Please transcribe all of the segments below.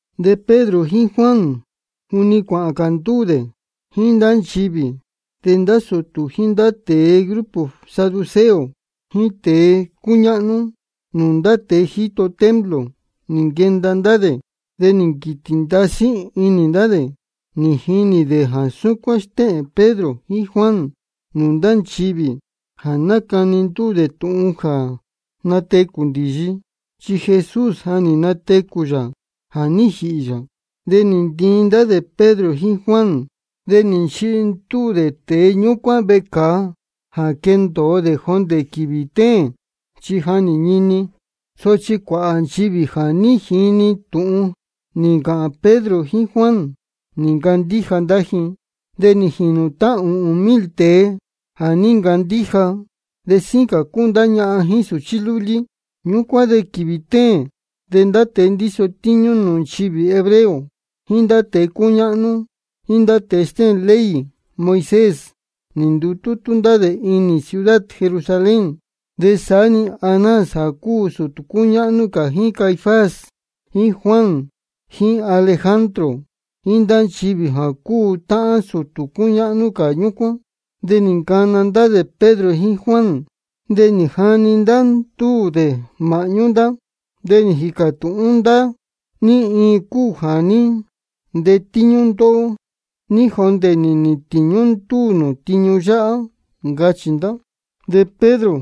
De Pedro jíín Juan juni cáhān cā ndúū dē jíín ndá nchivī, de ndá sūtū jíín ndá tēe grupo saduceo jíín tēe cúñáhnú nūū ndá tēe jā jíto templo, nī nquenda ndá dē. De nī nquītī ndasí inī ndá dē nī jinī dē jā súcuán stéhēn Pedro jíín Juan nūū ndá nchivī, jā nácani ndúū dē tūhun jā natecū ndīyi, chi Jesús de ja nī natecū yā jā ní jīhī yā. De nī ntiin ndá dē Pedro jíín Juan, de nī nchihi dē ndúū tēe ñúcuán vecāa jā quendōo dē jondē quīvī téēn, chi ja nī ñini. Sochi cuāhā nchivī jā ní jini tūhun nī ncāhān Pedro jíín Juan, nī ncandíja ndá ji. De nī jīnu tá ūhūn mil tēe jā ní ncandíja, de síín cā cúu ndá ñahan jíín sūchí lúlí. Ñúcuán de quīvī téēn de ndá tēe ndíso tíñú nūū nchivī hebreo, jíín ndá tēe cúñáhnú, jíín ndá tēe stéhēn ley Moisés, nī ndutútú ndá dē inī ciudad Jerusalén. De saá-ni Anás jā cúu sūtū cúñáhnú cā, jíín Caifás jíín Juan jíín Alejandro jíín ndá nchivī jā cúu táhán sūtū cúñáhnú cā ñúcuán. De nī ncana ndá dē Pedro jíín Juan, de nī jani ndá ndúū dē māhñú ndá, de nī jīcā tūhún ndá: ¿Ní iin cúu jā ní ntetíñú ndóhó de ní jondē nī nīhīn tīñú ndúū nū tiñu yáhá? ncachī ndá. De Pedro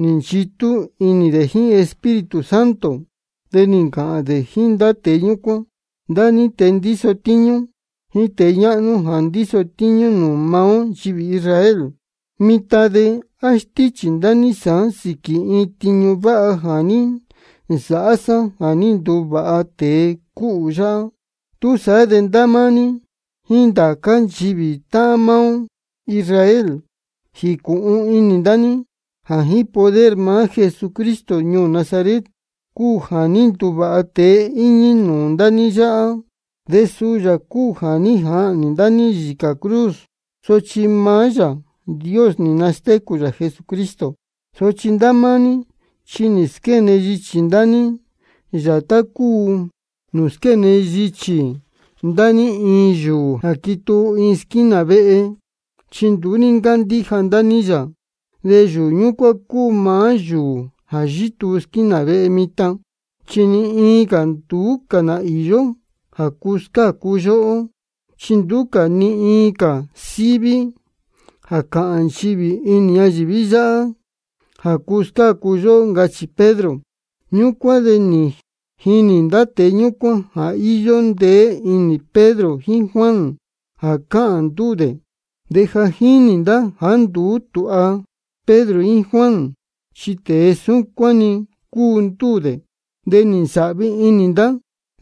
nī nchitú inī dē jíín Espíritu Santo, de nī ncāhān dē jíín ndá tēe ñúcuán: Ndá níhín tēe ndíso tíñú jíín tēe ñáhnú jā ndíso tíñú nūū maá ó nchivī Israel, mitan de ¿á stíchī ndá ní sāán sīquī iin tiñu váha jā ní nsāhá sá jā ní nduvāha tēe cúhū yáhá? Túsaá de ndá máá ní jíín ndá cā nchivī táhán maá ó Israel, jīcūhun inī ndá ní jā jíín poder maá Jesucristo ñuū Nazaret cúu jā ní nduvāha tēe íñí nūū ndá ní yáhá. De suu yā cúu jā ní jahnī ndá ní yīcā cruz, sochi maá Yāā Dios nī nastécū yā Jesucristo. Sochi ndá máá ní chi nī squéne yichī ndá ní yā tá cúu nūū squéne yichī ndá ní iin yūū jā quituu iin squínā vehe, chi nduú ní ncándíja ndá ní yā. De yūū ñúcuán cúu maá yūū jā yítuu squínā vehe mitan. Chi ni iin cā nduú cā ná īyó jā cuu scácu yóhó, chi nduú cā ni iin cā síví jā cáhān nchivī inī ñayīví yáhá jā cuu scácu yóhó, ncachī Pedro. Ñúcuán de nī jinī ndá tēe ñúcuán jā íyó ndeé inī Pedro jíín Juan jā cáhān ndúū dē. De ja jínī ndá jāá nduú tūha Pedro jíín Juan, chi tēe súcuán-ni cúu ndúū dē. De nī nsāhvi inī ndá,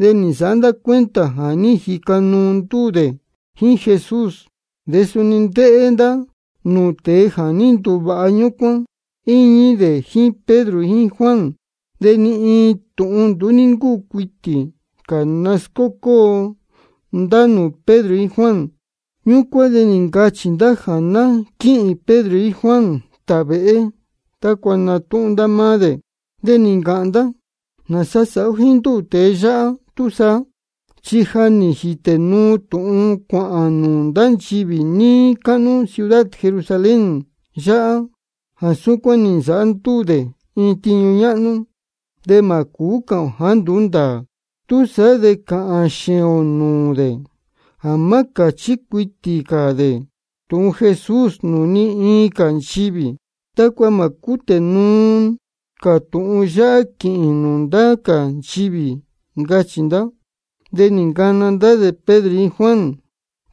de nī nsāhá ndá cuenta jā ní jica ndúū dē jíín Jesús. De suni ndéhé ndá nūū tēe jā ní nduvāha ñúcuán, íñí dē jíín Pedro jíín Juan. De ni iin tūhun nduú ní ncúu cuitī cā nascócóo ndá nūū Pedro jíín Juan. Ñúcuán de nī ncachī ndá jā ná quíhīn Pedro jíín Juan tāvēhé tácua natúhún ndá máá dē. De nī ncāhān ndá: ¿Nāsa sāhá ó jíín ndúū tēe yáhá túsaá? Chi ja nī jītē nuu tūhun cuāhān nūū ndá nchivī níí cáhnú ciudad Jerusalén yáhá jā súcuán nī nsāhá ndúū dē iin tiñu ñáhnú. De mā cūú cāhān ō jāá nduú ndāā. Túsaá de cāhān xēēn ō nūū dē jā má cāchí cuitī cā dē tūhun Jesús nūū ni iin cā nchivī, tácua mā cútē nuu cā tūhun yáhá quīhīn nūū ndá cā nchivī, ncachī ndá. De nī nacana ndá dē Pedro jíín Juan.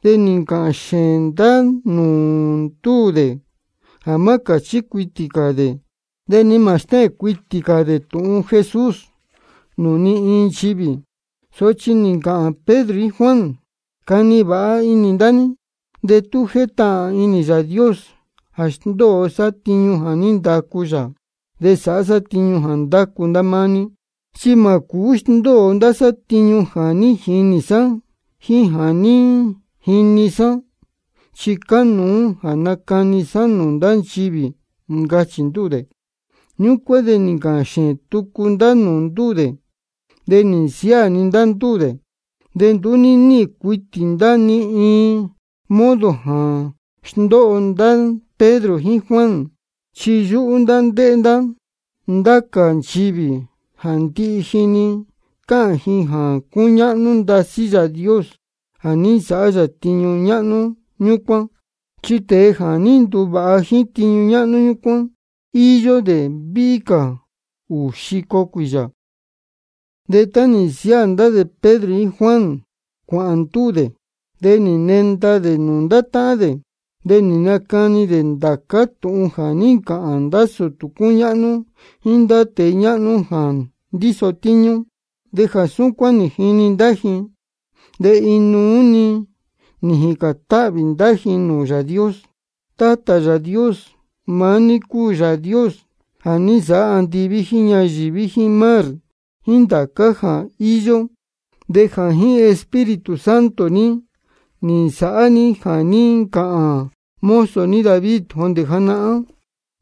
De nī ncāhān xēēn ndá nūū ndúū dē jā má cāchí cuitī cā dē de ni mā stéhēn cuitī cā dē tūhun Jesús nūū ni iin nchivī. Sochi nī ncāhān Pedro jíín Juan: Cani vāha inī ndá ní de tú jétahān inī Yāā Dios jā sndóo sá tiñu jā ní ndacu yā de sāhá sá tiñu jā ndácu ndá máá ní. Chi mā cūú sndóo ndá sá tiñu jā ní jinī sá jíín jā ní jini sá, chi cánuú jā nacani sá nūū ndá nchivī, ncachī ndúū dē. Ñúcuán de nī ncāhān xēēn tucu ndá nūū ndúū dē, de nī nsiáā-ni ndá ndúū dē. Chi nduú ní níhīn cuitī ndá ni iin modo jā sndóho ndá Pedro jíín Juan, chi yúhú ndá ndéhé ndá ndá cā nchivī, chi ndihi ji-ni cáhān ji jā cúñáhnú ndasí Yāā Dios jā ní nsāhá yā tiñu ñáhnú ñúcuán. Chi tēe jā ní nduvāha jíín tiñu ñáhnú ñúcuán, íyó dē víhí cā ūū xico cuīyā. De tá nī nsiáā ndá Pedro jíín Juan cuāhān ndúū dē, de nī nenda dē nūū ndá táhán dē. De nī nacani dē ndācá tūhun jā ní ncāhān ndá sūtū cúñáhnú jíín ndá tēe ñáhnú jā ndíso tíñú. De jā súcuán nī jini ndá ji, de inuú-ni nī jīcān táhvī ndá ji nūū Yāā Dios: Tátā Yāā Dios, maá ní cúu Yāā Dios jā ní nsāhá andiví jíín ñayīví jíín mar jíín ndācá cā jā íyó. De jā jíín Espíritu Santo ní nī nsāhá ní jā ní ncāhān mozo ní David jondē janahán: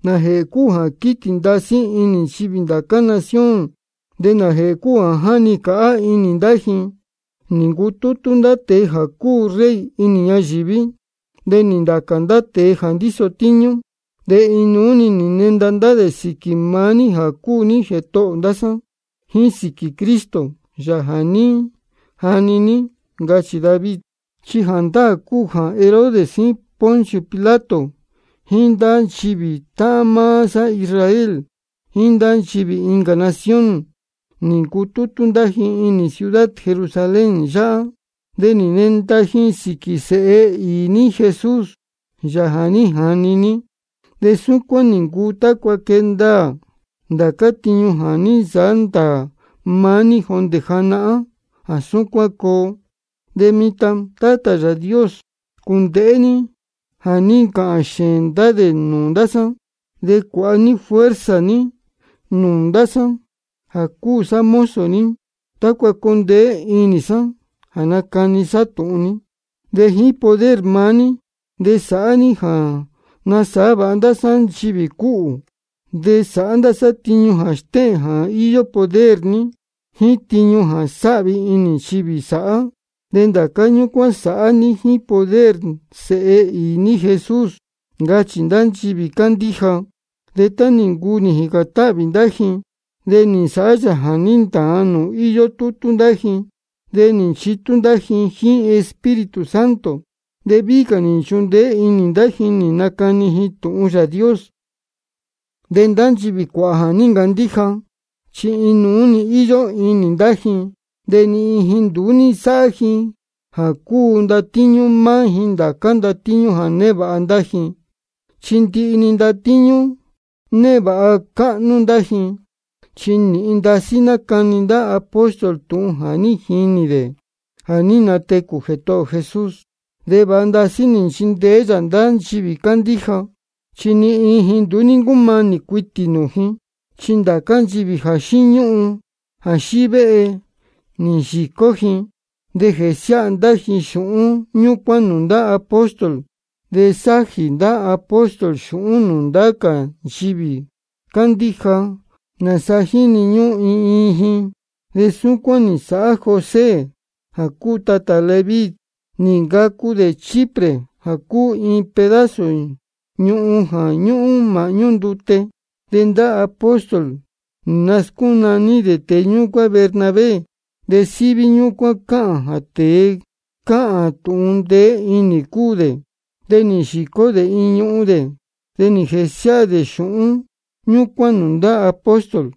¿Nājēhē cúu jā quítī ndasí inī nchivī ndá cā nación? ¿De nājēhē cúu jā jáni cāhá inī ndá ji? Nī ncutútú ndá tēe jā cúu rey inī ñayīví, de nī natacā ndá tēe jā ndíso tíñú, de inuú-ni nī nenda ndá dē sīquī maá ní jā cúu ní Jētohō ndá sá, jíín sīquī Cristo, Yāā jā ní jani ní. Ncachī David. Chi jāndáā cúu jā Herodes jíín Poncio Pilato jíín ndá nchivī táhán maá sá Israel jíín ndá nchivī incā nación, nī ncutútú ndá ji inī ciudad Jerusalén yáhá, de nī nenda ji sīquī Sēhe īī ní Jesús, Yāā jā ní jani ní. De súcuán nī ncuu tácua ná quée ndaā ndācá tiñu jā ní nsāhá ndāā maá ní jondē janahán jā súcuán coo. De mitan, Tátā Yāā Dios, cūndēhé ní jā ní ncāhān xēēn ndá dē nūū ndá sá. De cuāha ní fuerza ní nūū ndá sá jā cúu sá mozo ní, tácua coo ndeé inī sá jā nacani sá tūhun ní. De jíín poder maá ní de sāhá ní jā nasāhá vāha ndá sá nchivī cúhū, de sāhá ndá sá tiñu jā stéhēn jā íyó poder ní, jíín tiñu jā sāhvi inī nchivī sāhá. De ndācá ñúcuán sāhá ní jíín poder Sēhe īī ní Jesús, ncachī ndá nchivī cándíja. De tá nī ncuu nī jīcān táhvī ndá ji de nī nsāhá yā jā ní ntāan nūū íyó tútú ndá ji. De nī nchitú ndá ji jíín Espíritu Santo, de víhí cā nī nchundeé inī ndá ji nī nacani ji tūhun Yāā Dios. De ndá nchivī cuāhā jā ní ncandíja, chi inuú-ni íyó inī ndá ji. De ni iin ji nduú ní nsáhá ji jā cúu ndatíñú máá ji ndācá ndatíñú jā névāha ndá ji, chi ndihi-ni ndatíñú névāha cáhnú ndá ji. De nīhin ndasí nácani ndá apóstol tūhun jā ní jinī dē jā ní natecū Jētohō ō Jesús. De vāha ndasí nī nchindeé yā ndá nchivī cándíja. Chi ni iin ji nduú ná cúmanī cuitī nūū ji, chi ndācá nchivī jā xíñúhun jā xívéhe chi nī yīcó ji. De jésiáha ndá ji xūhún ñúcuán nūū ndá apóstol. De sájī ndá apóstol xūhún nūū ndá cā nchivī cándíja nāsa jíni ñúhún iin iin ji. De súcuán nī nsāhá José jā cúu tatā Leví, nī ncacu dē Chipre jā cúu iin pedazo ñuhun jā ñúhún māhñú ndute. De ndá apóstol nī nascúnaní dē tēe ñúcuán Bernabé. De síví ñúcuán cáhān jā tēe cáhān tūhun ndeé inī cúu dē. De nī yīcó dē iin ñuhun dē, de nī jēsiáha dē xūhún ñúcuán nūū ndá apóstol.